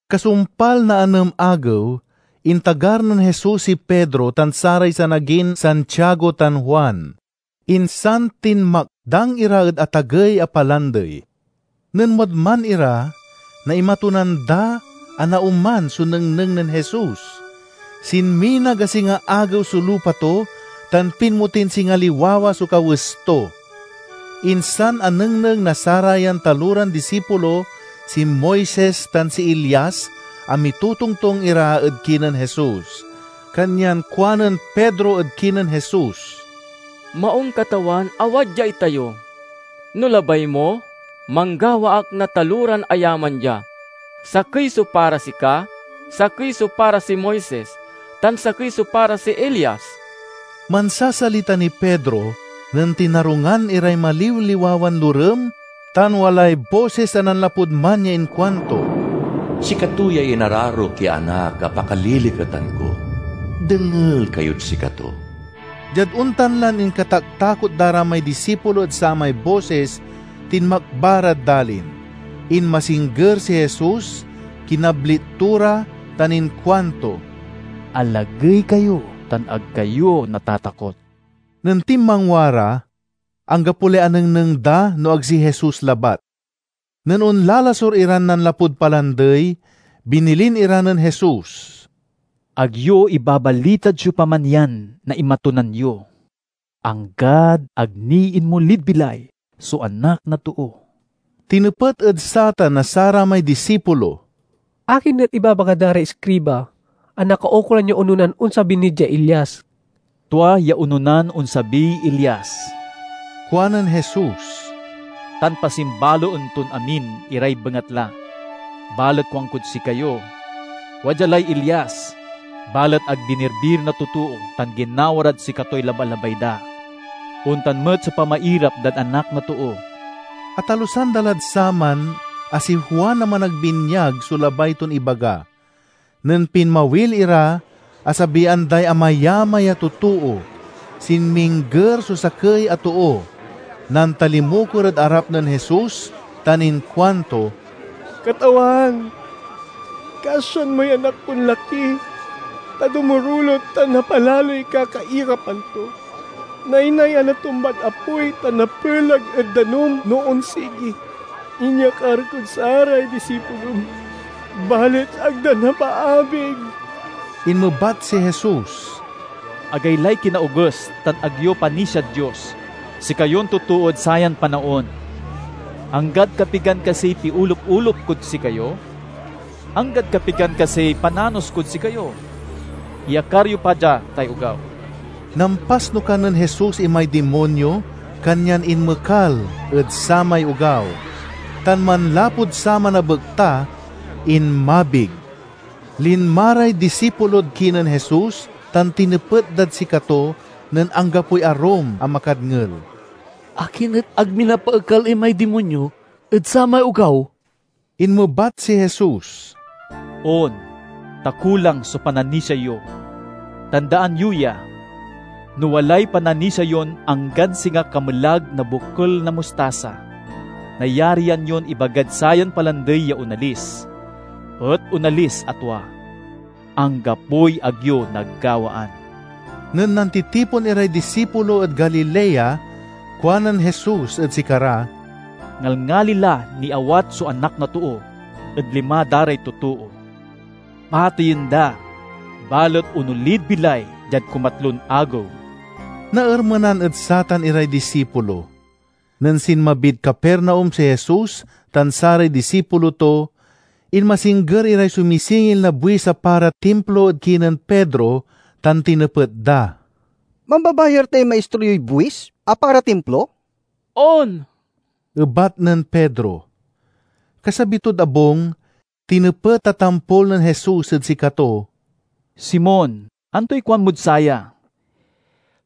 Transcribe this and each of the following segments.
Kasumpal na anem agew, intagar nen Jesus si Pedro tan saray sanagin Santiago tan Juan, insan tinmakdang ira ed atagey a palandey. Nen wadman ira naimatunan da a naoman so nengneng nen Jesus: sinminag a singa agew so lupa to tan pinmotin singa liwawa so kawes to. Insan anengneng na sarayan taloran disipulo si Moises tan si Elias a mitotongtong ira ed kinen Jesus. Kanyan kuanen Pedro ed kinen Jesus, "Maung, Katawan, a wadya itayo. No labay mo, manggawa ak na taloran ayaman dia: sakey so para sika, sakey so para si Moises, tan sakey so para si Elias." Mansasalita niy Pedro nen tinarungan iray maliwliwawan lorem tan walay bosis a nanlapud man ya inkuanto, "Sikato yay inararok ya Anak a pakaliliketan ko—dengel kayod sikato!" Diad ontan lan inkataktakot da ra may disipulo ed samay bosis, tinmakba rad dalin. Inmasingger si Jesus, kinablit to ra tan inkuanto, "Alagey kayo, tan ag kayo natatakot." Nen tinmangwa ra, anggapo lay anengneng da no ag si Jesus labat. Nen onlalasur iran nanlapud palandey binilin ira nen Jesus, "Ag yo ibabalitad siopaman yan naimatunan yo, anggad ag ni inmolid bilay so Anak na Too." Tinepet ed satan na saramay disipulo, "Akin et ibabaga da ray iskriba a nakaukolan ya ononan onsabi ni diay Elias?" "Tua ya ononan onsabiy Elias," kuanen Jesus, "tan pasimbaloen ton amin iray bengatla. Balet kuankod sikayo: Wadya lay Elias, balet ag binirbir na totoo tan ginawa rad sikatoy labalabay da. Ontan met so pamairap dad Anak na Too." Atalusan da lad saman a si Juan a Managbinyag so labay ton ibaga. Nen pinmawil ira asabian day amayamay a totoo. Sinmingger so sakey a too, nantalimukor ed arap nen Jesus tan inkuanto, "Katawan, kasian moy anak kon laki, ta dumurulot tan mapalaloy kakairapan to. Naynay a natumbad apoy tan napelag ed danum no onsigi. Inyakar kod saray disipulom, balet ag da napaabig." Inmebat si Jesus: "Agaylay kinaoges tan ag yo panisiad Dios, sikayon totood sayan panaon! Anggad kapigan kasiy piolup-olup kod sikayo? Anggad kapigan kasiy pananos kod sikayo? Iyakar yo pa dia tay ogaw." Nampasnukan nen Jesus imay dimonyo, kanyan inmekal ed samay ogaw. Tan manlapud saman a bekta, inmabig. Linma ray disipulo kinen Jesus tan tinepet dad sikato nen anggapoy arum a makadngel, "Akin et ag mi napaekal imay dimonyo ed samay ogaw?" Inmebat si Jesus, "On, ta kulang so pananisia yo. Tandaan yo ya! No walay pananisia yon anggan singa kamelag na bokel na mustasa, nayarian yon ibagad sayan palandey ya onalis, et onalis a tua. Anggapoy ag yo nagawaan!" Nen nantitipon iray disipulo ed Galilea, kuanen Jesus ed sikara, "Ngalngali la niawat so Anak na Too ed lima da ray totoo. Pateyen da, balet onolid bilay diad kumatlon agew." Naermenan ed satan iray disipulo. Nen sinmabid Capernaum si Jesus tan saray disipulo to, inmasingger iray sumisingil na buis a para Timplo ed kinen Pedro tan tinepet da, "Mambabayar tay Maistro yoy buis a para Timplo?" "On!" ebat nen Pedro. Kasabi tod abung, tinepet a tampol nen Jesus ed sikato, "Simon, antoy kuanmod saya?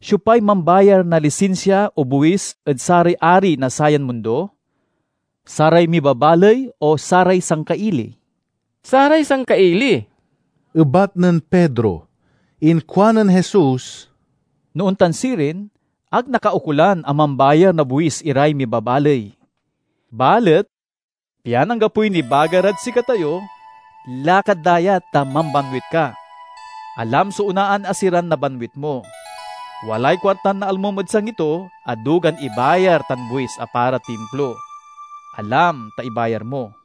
Siopay mambayar na lisinsia o buis ed saray ari na sayan mundo? Saray mibabaley o saray sangkaili?" "Saray sangkaili," ebat nen Pedro. Inkuanen Jesus, "No ontan sirin, ag nakaukolan a mambayar na buis iray mibabaley. Balet pian anggapoy nibaga rad sikatayo, lakad dayat ta mambanwit ka. Alam so onaan a siran nabanwit mo. Walay kuartan naalmom ed sangi to a dugan ibayar tan buis a para Timplo. Alam, ta ibayar mo."